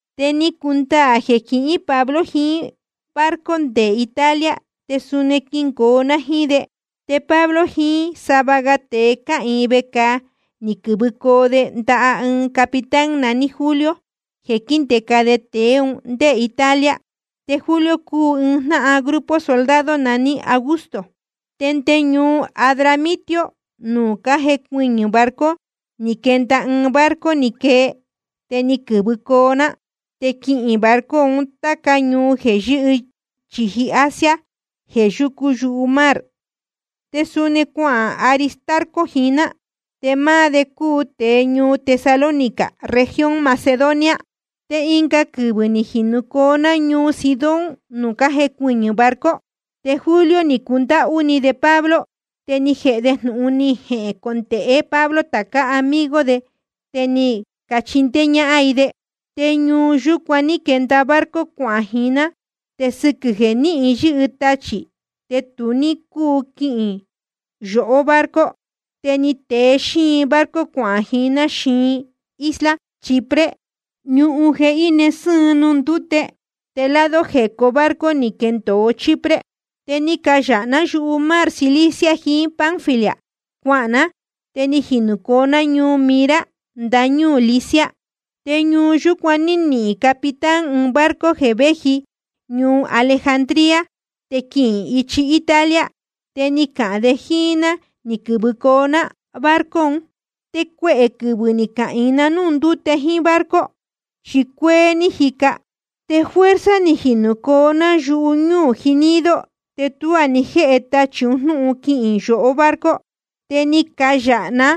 Te ni cundaā jeē quihín Pablo jiín barco nde Italia, te suni quingoo ná jíín de. Te Pablo jiín sava ga tēe cáhīin vecāa ni quɨ̄vɨcoo de ndaha ɨɨn capitán naní Julio jeē quíndēca de tēe un ndé Italia. Te Julio cúu ɨɨn jnáhan grupo soldado naní Augusto. Te nde ñuu Adramitio nuū cájecuɨñɨ̄ barco ni quenda ɨɨn barco ni quee, te ni quɨ̄vɨcoo ná, te quihīn barco un táca ñuu jeē yɨ́hɨ chīji Asia jeē yúcu yumar. Te suni cuahān Aristarco jiín ná, te máá de cúu tēe ñuu Tesalónica región Macedonia. Te ɨnga quɨvɨ̄ ni jinūcoo ná ñuu Sidón nuū cájecuɨñɨ̄ barco. Te Julio ni cundáhú ni de Pablo, te ni jēhe de jnūhun ni jecondēhe Pablo tācá amigo de, te ni cachindéé ñáhán i de. Te ñuu yúcuan ní quenda barco cuahān jiín ná. Te sɨquɨ̄ jeē níhin yɨ́hɨ tachī te tu ní cúu quihīn yohó barco, te ni tee xíin barco cuahān jiín ná xiin isla Chipre, ñuhun jeē íne sɨ́ɨn nuū ndúte, te lado jecó barco ni quendōo Chipre. Te ni cayāha ná yumar Cilicia jiín Panfilia cuahān ná, te ni jinūcoo ná ñuu Mira ndañúū Licia. Te ñuu yúcuan ní nihīn capitán ɨɨn barco jeē véji ñuu Alejandría te quihīn ichi Italia, te ni cahān de jíín ná ni quɨ̄vɨcoo ná barco un. Te cuehē quɨvɨ̄ ni cahīin na núū ndúte jíín barco, chi cuéé ní jica, te fuerza‑ni ni jinūcoo ná yuñúū Gnido. Te tuá ni jéhe tachī un jnúhun quihīn yohó barco, te ni cayāha ná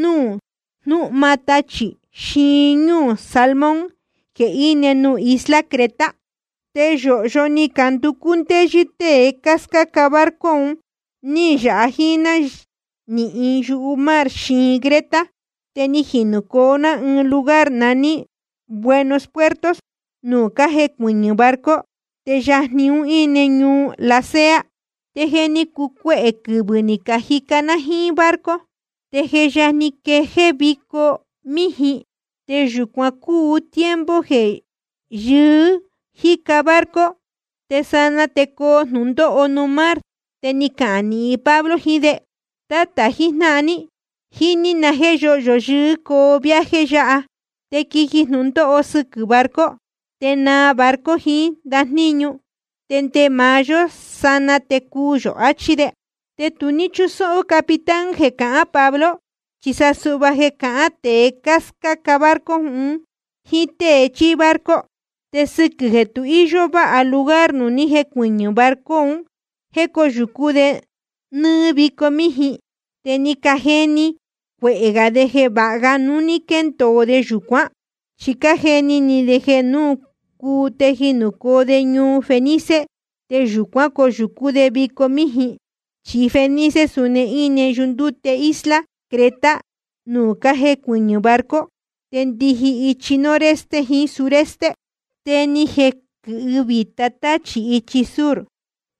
núū jnúhma tachī xiin ñúū Salmón jeē íne nuū isla Creta. Te yōhyo ni canducú ndéyɨ́ tée cáscáca barco un, ní yāha jíín ná nɨɨ́ yumar xiin Creta. Te ni jinūcoo ná ɨɨn lugar naní Buenos Puertos nuū cájecuɨñɨ̄ barco, te yajni un íne ñuu Lasea. Te je ni cuu cuehē quɨvɨ̄ ni cajica ná jíín barco. Te je yajni quejéé vico míjin, te yūcuan cúu tiempo jeē yɨɨ́ jíca barco te sanaa te coo jnūndóho nuū mar. Te ni cahān nīhin Pablo jiín de: Tátā jijnáhan ní, jíní na jéē yóhyo yɨɨ́ coo viaje yáha, te quiji jnūndóho sɨquɨ̄ barco, te naa barco jiín ndajníñu, te nde maá yó sanaa te cuu yō, achí de. Te tu ní chúsóhó capitán jeē cahán Pablo, chi sa suhva jeē cahán tēe scáca barco un jíín tée chíí barco. Te sɨquɨ̄ jeē tu íyó váha lugar nuū ni jécuɨñɨ̄ barco un jéē cóyūcú de nɨ́ɨ́ vico míjin, te ni cajeni ni cuehē gā de jeē vāha ga núu quendacoo de yūcuán. Chi cájeni ni de jeē núu cuu te jinūcoo de ñuu Fenice te yūcuán coyūcú de vico míjin. Chi Fenice suni íne yundúte isla Creta nuū cájecuɨñɨ̄ barco, te ndijin ichi noroeste jiín suroeste. Te ni jequɨ̄hɨ vīta táchī ichi sur,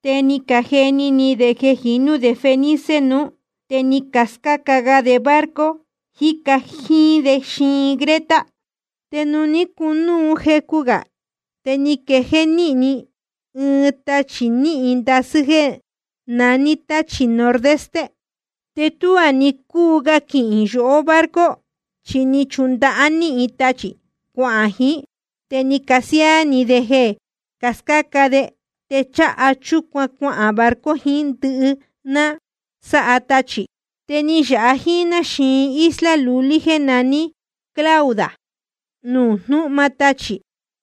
te ni cajeni ni de jeē jinú de Fenice nuú, te ni cascáca ga de barco jíca jíín de xiin Creta. Te ni cunúu jecu gā, te ni quejéé‑ni ɨɨn tachī níhin ndasɨ́ jeē naní táchī nordeste. Te tuá ni cúu ga quihīn yohó barco, chi ni chundahá‑ni tachī cuahān jiín, te ni casiáá‑ni de jeē cascáca de, te cháha chúcuan cuahān barco jiín ndɨhɨ ná sáha tachī. Te ni yāha jíín ná xiin isla lulí jéē naní Clauda, nuū jnúhma tachī.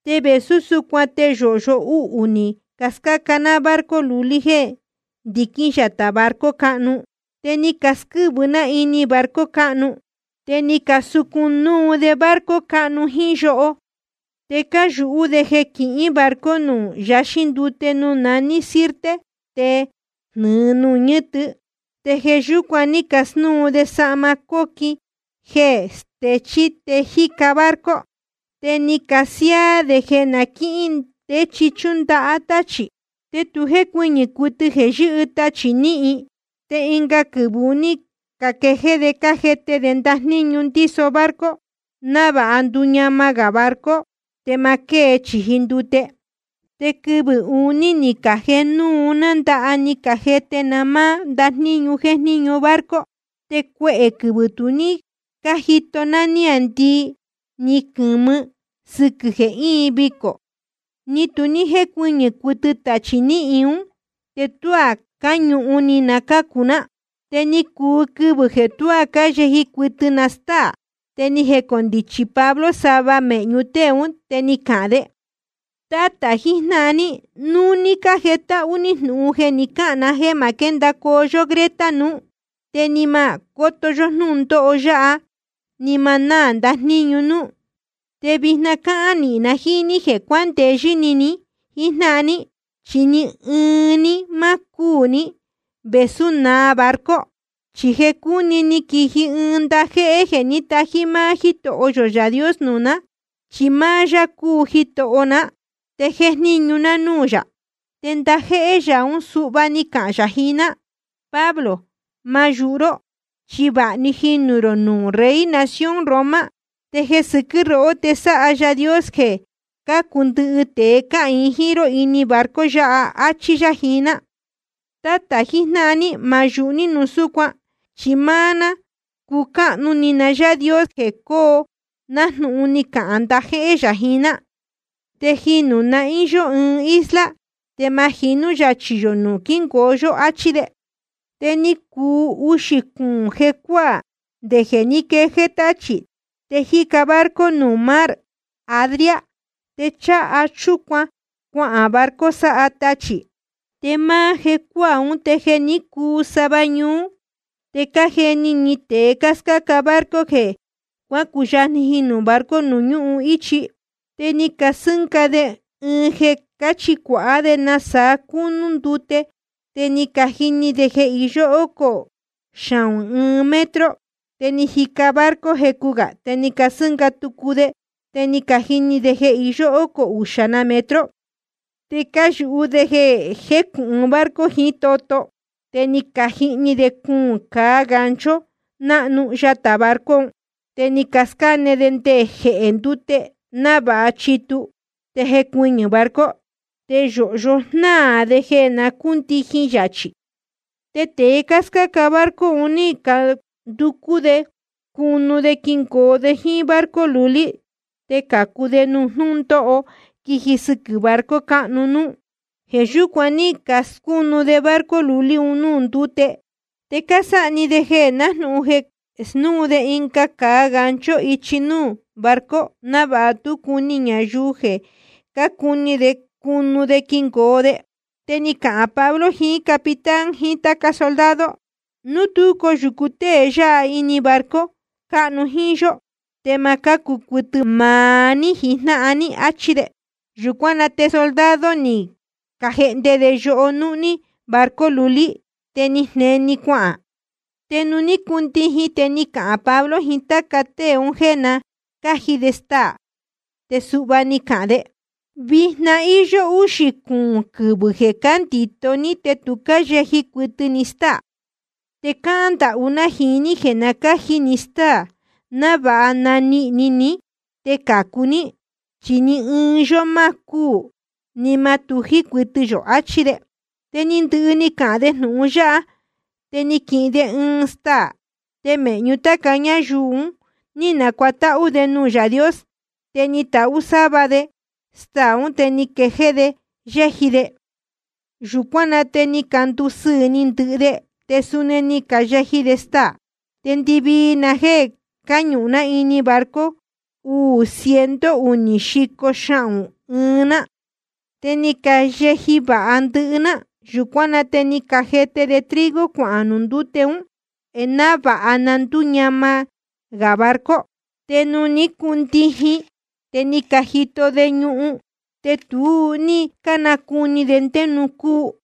Te vēsú súcuan te yōhyo uhū ni cascáa ná barco lulí jeē ndiquín yatā barco cáhnu. Te ni casquɨ́vɨ ná ini barco cáhnu. Te ni casucun núu de barco cáhnu jíín yoho. Te cáyūhú de jeē quihín barco nuū yaxín ndute nuū naní Sirte te jnɨ̄ɨ nuū ñɨ́tɨ, te jeē yúcuan ní casnúu de sahma cóquin jeē stechí te jíca barco. Te ni casiáá de jeē na quíhín ndé chi chúndahá táchī. Te tu jécuɨñɨ̄ cuɨtɨ jeē yɨ́hɨ tachī níhin. Te ɨnga quɨvɨ̄ un ní caquejéé de cájete de ndajníñu ndíso barco, návāha nduñama gā barco te ma quée chīji ndute. Te quɨvɨ̄ uní ni cajēhe núu ná ndaha ni cajete ná máá ndajníñu jéjníñu barco. Te cuehē quɨvɨ̄ tu ní cájito ná níāndii ni quɨ̄mɨ sɨquɨ̄ jeē íin vicō, ni tu jécuɨñɨ̄ cuɨtɨ tachī níhin ún, te tuá cáñūhun ni na cácu ná. Te ni cuu quɨvɨ̄ jeē tuá cáyeji cuɨtɨ na stáā. Te ni jecondichi Pablo sava mēhñu tée ún, te ni cahān de: Tátā jijnáhan ní, núu ní cájetáhú ní jnūhun jeē ni cáhān ná te ma quéndacoo yó Creta nuú, te ni ma cóto yó jnúndóho yáha ni ma náā ndajníñu núú. Te vijna cáhán nīhin na jíín ní jeē cuandeyɨ́ ni ni jíjnáhan ní, chi ni ɨɨn ní má cúū ní, vēsú naa barco. Chi jeē cúni ni quiji ɨɨn ndajéhé jeē ní tají máá Yáā Dios nuū ná. Chi máá yá cúu Jitoho ná, te jéjníñu ná núū yā. Te ndajéhé yā ún suhva ni cahān yā jiín ná: Pablo, ma yūhu ró, chi vāha‑ni jinū rō nuū rey nación Roma, te jeē sɨquɨ́ rohó te sáha Yaā Dios jeē cácu ndɨhɨ tēe cáhīin jíín ró ini barco yāhá, áchí yá jiín ná. Tátā jijnáhan ní, ma yūhu ní núu súcuan, chi máá ná cúcáhnu ni na Yáā Dios jeē coo nájnūhun ni cahān ndajéhé yā jiín ná. Te jinū nahín yó ɨɨn isla, te ma jinú yachī yō nuū quíngoo yó, áchí de. Te ni cuu uxī cuūn jecuáā nde jeē ní quejéé táchī, te jíca barco nuū mar Adria, te cháha chúcuan cuahān barco sáha tachī. Te máá jecuáā ún te jeē ní cuu sava ñuú te cájeni ni tēe cáscáca barco jeē jé cuacuyajni jinū barco ñuhun íchi. Te ni casɨ́nga de ɨɨn jeē cáchicuāhá de nasaa cúnú ndute, te ni cajini de jeē iyó ócō xahūn ɨɨn metro. Te ni jica barco jecu gā te ni casɨ́nga tucu de, te ni cajini de jeē iyó ócō uxā na metro. Te cáyūhú de jeē jécujnáhan barco jiín toto, te ni cajihni de cuūn cāa gancho náhnu yatā barco un, te ni cascáne de nde jehē ndúte návāha chituu te jecuɨñɨ̄ barco. Te yōhyo jnáā de jeē na cúndijin yachī. Te tēe cáscáca barco un ní canducú de cunu de quingoo de jíín barco lulí te cācu de nuū jnúndóho quiji sɨquɨ̄ barco cáhnu núú. Jeē yúcuan ní casnúu de barco lulí un núū ndúte, te cásáha‑ni de nájnūhun jeē snúu de ɨnga cāa gancho ichi núú barco návāha tú cuni ñayuu jeē cácuni de cunu de quingoo de. Te ni cahān Pablo jiín capitán jiín táca soldado: Núu tú coyūcu tée yáha ini barco cáhnu jíín yó, te ma cácu cuɨtɨ maá ní jijnáhan ní, áchí de. Yūcuán na te soldado ni cajehnde de yoho núhní barco lulí, te ni jneni‑ni cuahān. Te nuū cuácundijin te ni cahān Pablo jiín táca tée un jéē na cáji de staā. Te suhva ni cahān de: Vijna íyó úxī cuūn quɨvɨ̄ jeē cándīto ní te tu cáyeji cuɨtɨ ni stáā. Te cáhán ndahú ná jiín ní jeē na cáji ni stáā, návāha nanihīn ni ní te cācu ní, chi ni ɨɨn yó má cúū, ni ma tují cuɨtɨ yō, achí de. Te ni ndɨhɨ ni cahān de jnūhun yáha, te ni quihin de ɨɨn staā, te mēhñu táca ñáyuu un ní nacuatáhú de nuū Yaā Dios, te ni tahú sáva de staā ún, te ni quejéé de yéji de. Yūcuán na te ni candusɨɨ̄ ni ndɨhɨ de, te suni ni cayeji de staā. Te ndɨvii na jéē cáñūhun ná ini barco cúu uū ciento unī xico xahūn ɨɨn ná. Te ni cayeji vāha ndɨhɨ ná. Yūcuán na te ni cajete de trigo cuahān nuū ndúte un, návāha na ndúñama gā barco. Te nuū ní cundijin te ni cajito de ñuhun, te tu ní cánacuni de ndé nuū cúu.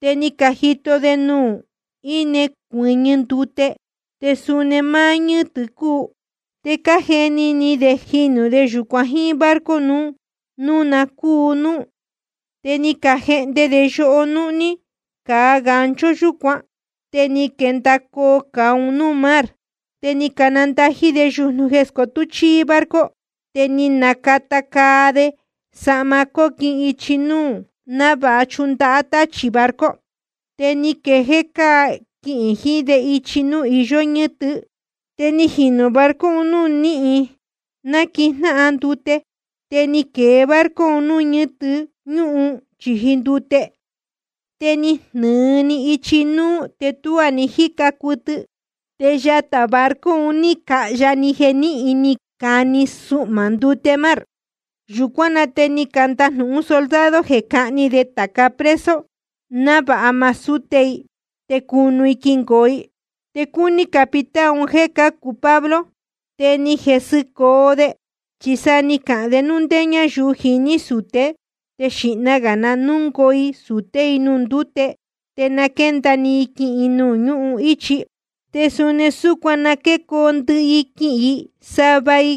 Te ni cajito de nuū íne cuɨ́ñɨ ndute, te suni máá ñɨ́tɨ cúu, te cájeni ni de jinū de yūcuan jíín barco núu na cúu núú. Te ni cajehnde de yoho núhní cāa gancho yúcuan, te ni caquendōo cāa un núū mar. Te ni canandají de yujnu jeē scotú chíí barco, te ni nacata caa de sahma cóquin ichi núú návāha chundahá táchī barco, te ni quejéé caca quihīn jiín de ichi núū iyó ñɨ́tɨ. Te ni jinū barco nuú níhin náquijnáhan ndute. Te ni quēe barco nuū ñɨ́tɨ ñúhun chīji ndute, te ni jnɨ̄ɨ‑ni ichi núú te tuá ni jíca cuɨtɨ, te yatā barco un ní cahya‑ni jeē níhin ni cani suhmā ndute mar. Yūcuán na te ni candajnūhún soldado jeē cáhni de tāca preso návāha ma súte i te cunu i quingoo i. Te cúní capitán un jéē cācu Pablo, te ni jesɨcoo de. Chi sa ni cahān de núu ndé ñáyuu jiní sūté te xīhna gā i na núngoo i sūté i nuū ndúte, te na quénda‑ni i quihīn i nuū ñúhun íchi. Te suni súcuan na quécoo ndɨhɨ i quihīn i, sava i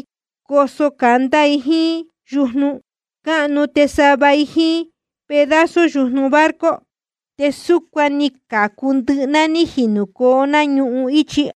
coso candá i jíín yujnu cúnu te sava ga i jíín pedazo yujnu barco. Te súcuan ni cacācu ndɨhɨ ná ní jinūcoo ná ñuhun íchi.